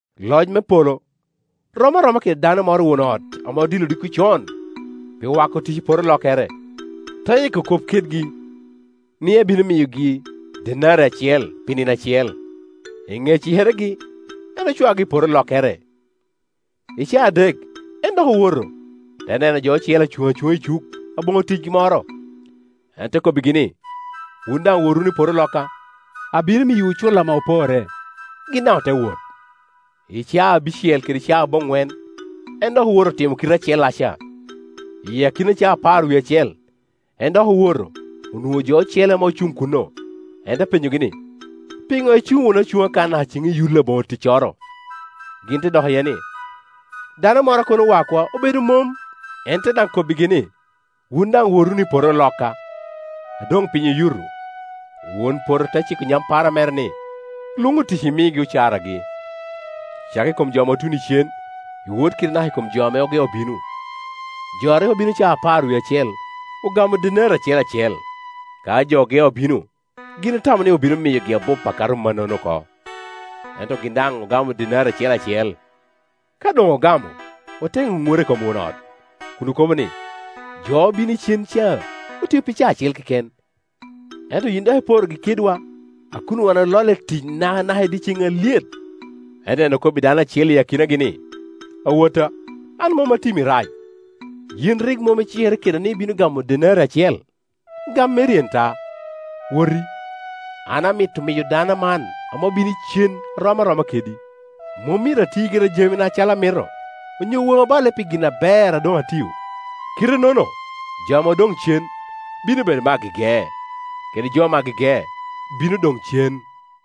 “Loc me polo rom aroma kede dano moro won ot ame odilo odiko con pi wako otic i poto olokkere. Te yiko kop kedgi ni ebino miyogi denari acel pi nino acel, i ŋe cikeregi en ocwaogi i poto olokkere. I caa adek en dok owoto, te neno jo ocele ame acuŋ acuŋa i cuk aboŋo ticgi moro. En te kobbigi ni, ‘Wun daŋ wot wunu i poto olokka, abino miyowu cul ame oporre.’ Gin daŋ ote wot. I caa abicel kede caa aboŋwen en dok owoto otimo i kite acellaca. I akina caa apar wie acel en dok owoto onwoŋo jo ocele ame acuŋ kuno; en te penyogi ni, ‘Piŋo icuŋ wunu acuŋa kan naka ceŋ iyul aboŋo ticcoro?’ Gin te dok iye ni, ‘Dano moro a kono wakwa obedo mom.’ En te daŋ kobbigi ni, ‘Wun daŋ wot wunu i poto olokka.’ A doŋ piny oyuto, won poto te ciko nyampara mere ni, ‘Lwoŋ otic, imigi ocaragi. Cak i kom jo ame otuno icen, iwot kede anaka i komjo ame ogeo bino.’ Jo a rik obino caa apar wie acel, ogamo denari acel acel. Ka jo ogeo obino, gin otamo ni obino miyogi abup akato mannono oko, ento gin daŋ ogamo denari acel acel. Ka doŋ ogamo, ote ŋunura i kom won ot, kun okobo ni, ‘Jo obino icen ca otio pi caa acel keken, ento yin dok iporogi kedwa a kun wan ololle i tic nakanaka i dye ceŋ alyet.’ Ento en okobbi dano acel i akinagi ni, ‘Awotta, an mom timi rac. Yin rik mom icikere keda ni ibino gamo denari acel? Gam meri en ta, woti. An amito miyo dano man ame obino icen arom aroma kedi. Mom myero ati gira i jamina acalo amito? Onyo waŋi oballe pi gin aber a doŋ atio?’ Kite-nono jo ame odoŋ cen bino bedo me agege, kede jo me agege bino doŋ cen.”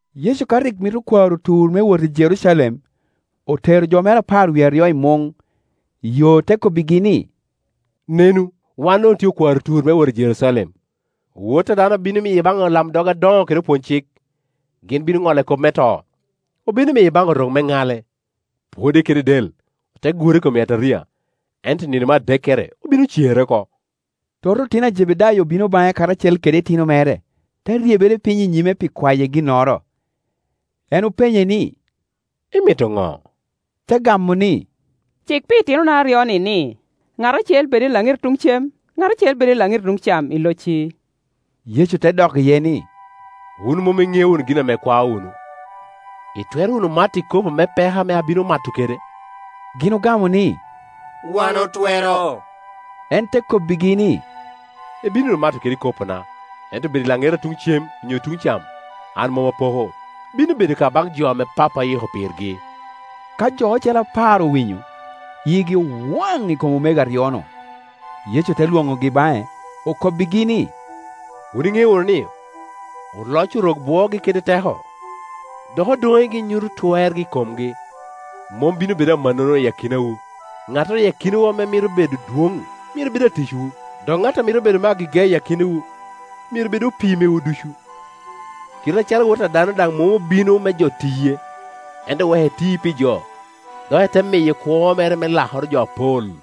Yecu ka rik mito kwaro tur me wot i Jerucalem, otero jo mere apar wie aryo i muŋ, i yo te kobbigi ni, “Nenu, wan doŋ otye okwaro tur me wot i Jerucalem. Wot a dano obino miye baŋ olamdog adoŋo kede opwony-cik, gin bino ŋolle kop me to. Obino miye baŋ Orok me ŋale, pwode kede del, ote gure i kom yataria, ento i nino me adekere obino cere oko.” Toto otino a Jebedayo obino baŋe karacel kede itino mere, te ryebere piny i nyime pi kwaye ginnoro. En openye ni, “Imito ŋo?” Te gamo ni, “Cik pi itinona aryo-ni ni, ŋat acel bed i laŋeti tuŋ cem, ŋat acel bed i laŋeti tuŋ cam i locci.” Yecu te dok iye ni, “Wun mom iŋeo wunu gin ame ikwao wunu. Itwero wunu mato i kopo me peko ame abino mato kede?” Gin ogamo ni, “Wan otwero.” En te kobbigi ni, “Ibino wunu mato kede ikopona, ento bedo i laŋeta tuŋ cem onyo tuŋ cam, an mom apoko. Bino bedo ka baŋ jo ame Pappa oyiko pirgi.” Ka jo ocele apar owinyo, yigi owaŋ i kom omego aryo-nu. Yecu te lwoŋogi baŋe, okobbigi ni, “Wun iŋeo wunu ni, oloc Orok bwoogi kede teko, dok odoŋegi nyuto twergi i komgi. Mom bino bedo amannono i akinawu; ŋattoro i akinawu ame mito bedo adwoŋ myero bed aticwu, dok ŋattoro amit bedo me agege i ak inawu, myero bed opii mewu ducu; kite acalo Wot a dano daŋ mom obino me jo tiye, ento wek en ti pi jo, dok ete miyo kwo mere me lakoro jo apol.”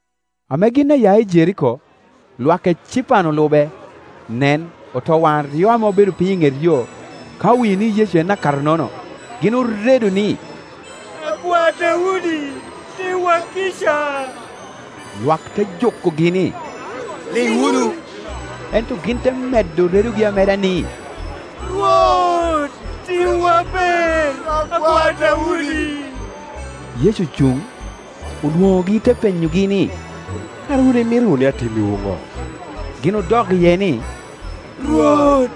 Ame gin aya i Jeriko, lwak ecipan olube. Nen, otowaŋ aryo ame obedo piny i ŋet yo, ka owinyo ni Yecu en akato-nono, gin oredo ni, “Akwar Daudi, timwa kica.” Lwak te jukogi ni, “Liŋ wunu”, ento gin te medo redogi ameda ni, “Rwot, timwa ber, Akwar Daudi.” Yecu ocuŋ, olwonogi te penyogi ni, “Kara wun imito wunu ni atimmiwu ŋo?” Gin odok iye ni, “Rwot,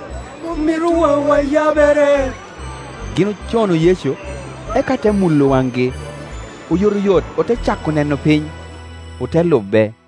omito waŋwa yabere.” Gin ocono Yecu, eka te mulo waŋgi. Oyotoyot ote cako neno piny, ote lube.